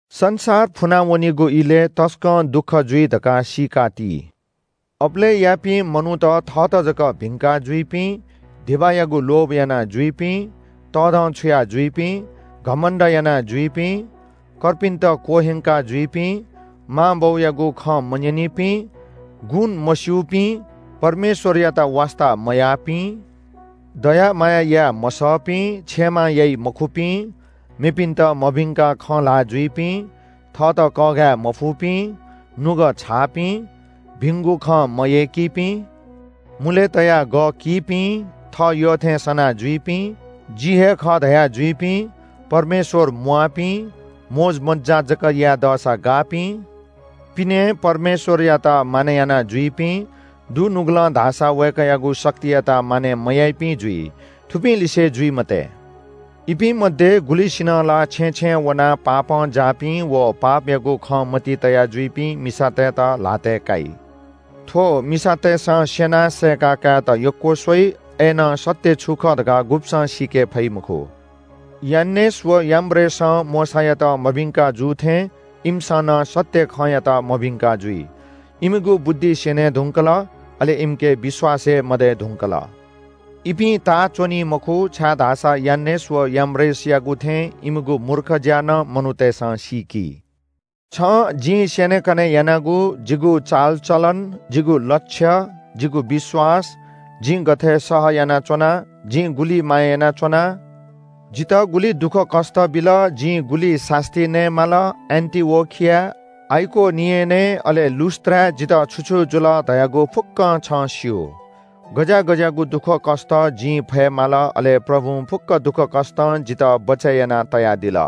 संसार फुनावनीगु इलय् तसकं दुःख जुइ धकाः सीकाति। अबलय्‌यापिं मनूत थःत जक भिंका जुइपिं, धिबायागु लोभ यानाजुइपिं, तःधंछुया जुइपिं, घमण्‍ड यानाजुइपिं, कर्पिन्‍त क्‍वह्यंका जुइपिं, मांबौयागु खँ मन्‍यनीपिं, गुण मस्‍यूपिं, परमेश्‍वरयात वास्‍ता मयाःपिं, दया माया याये मसःपिं, क्षमा याइमखुपिं, मेपिन्‍त मभिंकाः खँ ल्‍हानाजुइपिं, थःत कःघाये मफुपिं, नुगः छाःपिं, भिंगु खँ मयय्‌कीपिं, मुले तयाः गः कीपिं, थः यःथें सना जुइपिं, जि हे खः धयाजुइपिं, परमेश्‍वरयात यय्‌केगु स्‍वयाः मोजमज्‍जा जक याये यय्‌कीपिं, पिनें परमेश्‍वरयात मानय् यानाजुइपिं, दुनुगलं धाःसा वय्‌कःयागु शक्तियात मानय् मयाइपिं जुइ। थुपिंलिसे जुइ मते। इपिं मध्‍ये गुलिसिनं ला छेँय् छेँय् वनाः पापं जाःपिं व पापयागु खँ मतिइ तया जुइपिं मिसातय्‌त ल्‍हातय् काइ। थ्‍व मिसातय्‌सं स्‍यनाः सय्‌का कायेत यक्‍व स्‍वइ। अय्‌नं सत्‍य छु खः धकाः गुब्‍सं सीके फइ मखु। यान्‍नेस व याम्‍ब्रेसं मोशायात मभिंका जू थें इमिसं नं सत्‍य खँयात मभिंका जुइ। इमिगु बुद्धि स्‍यने धुंकल, अले इमिके विश्‍वास हे मदये धुंकल। इपिं ताः च्‍वनी मखु, छाय्‌धाःसा यान्‍नेस व याम्‍ब्रेसयागु थें इमिगु मूर्ख ज्‍या नं मनूतय्‌सं सीकी। छं जिं स्‍यनेकने यानागु, जिगु चालचलन, जिगु लक्ष्य, जिगु विश्‍वास, जिं गथे सह यानाच्‍वना, जिं गुलि माया यानाच्‍वना, जितः गुलि दुःखकष्‍ट बिल, जिं गुलि सास्‍ती नये माल, एन्‍टिओखियाय्, आइकोनियनय् अले लुस्‍त्राय् जितः छु छु जुल धयागु फुक्‍कं छं स्‍यू। गज्‍याः गज्‍याःगु दुःखकष्‍ट जिं फये माल अले प्रभुं फुक्‍क दुःखकष्‍टं जितः बचय् याना तयादिल।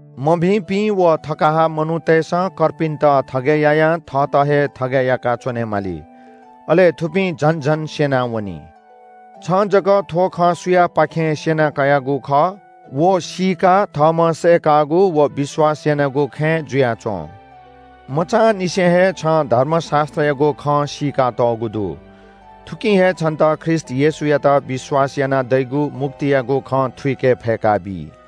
मभिंपिं व थगाहा मनूतय्‌सं कर्पिन्‍त थगय् यायां थःत हे थगय् याका च्‍वनेमाली। अले थुपिं झन झन स्‍यनावनी। छं जक थ्‍व खँ सुयापाखें स्‍यना कयागु खः, व सीकाः थःम्‍हं सय्‌कागु व विश्‍वास यानागु खँय् जुयाच्‍वँ। मचांनिसें हे छं धर्मशास्‍त्रयागु खँ सीकातःगु दु। थुकिं हे छन्‍त ख्रीष्‍ट येशूयात विश्‍वास यानाः दइगु मुक्तियागु खँ थुइके फय्‌का बी।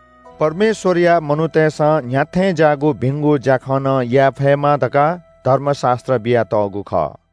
परमेश्‍वरया मनूतय्‌सं न्‍ह्याथें ज्‍याःगु भिंगु ज्‍याखँ नं याये फयेमा धकाः धर्मशास्‍त्र बियातःगु खः।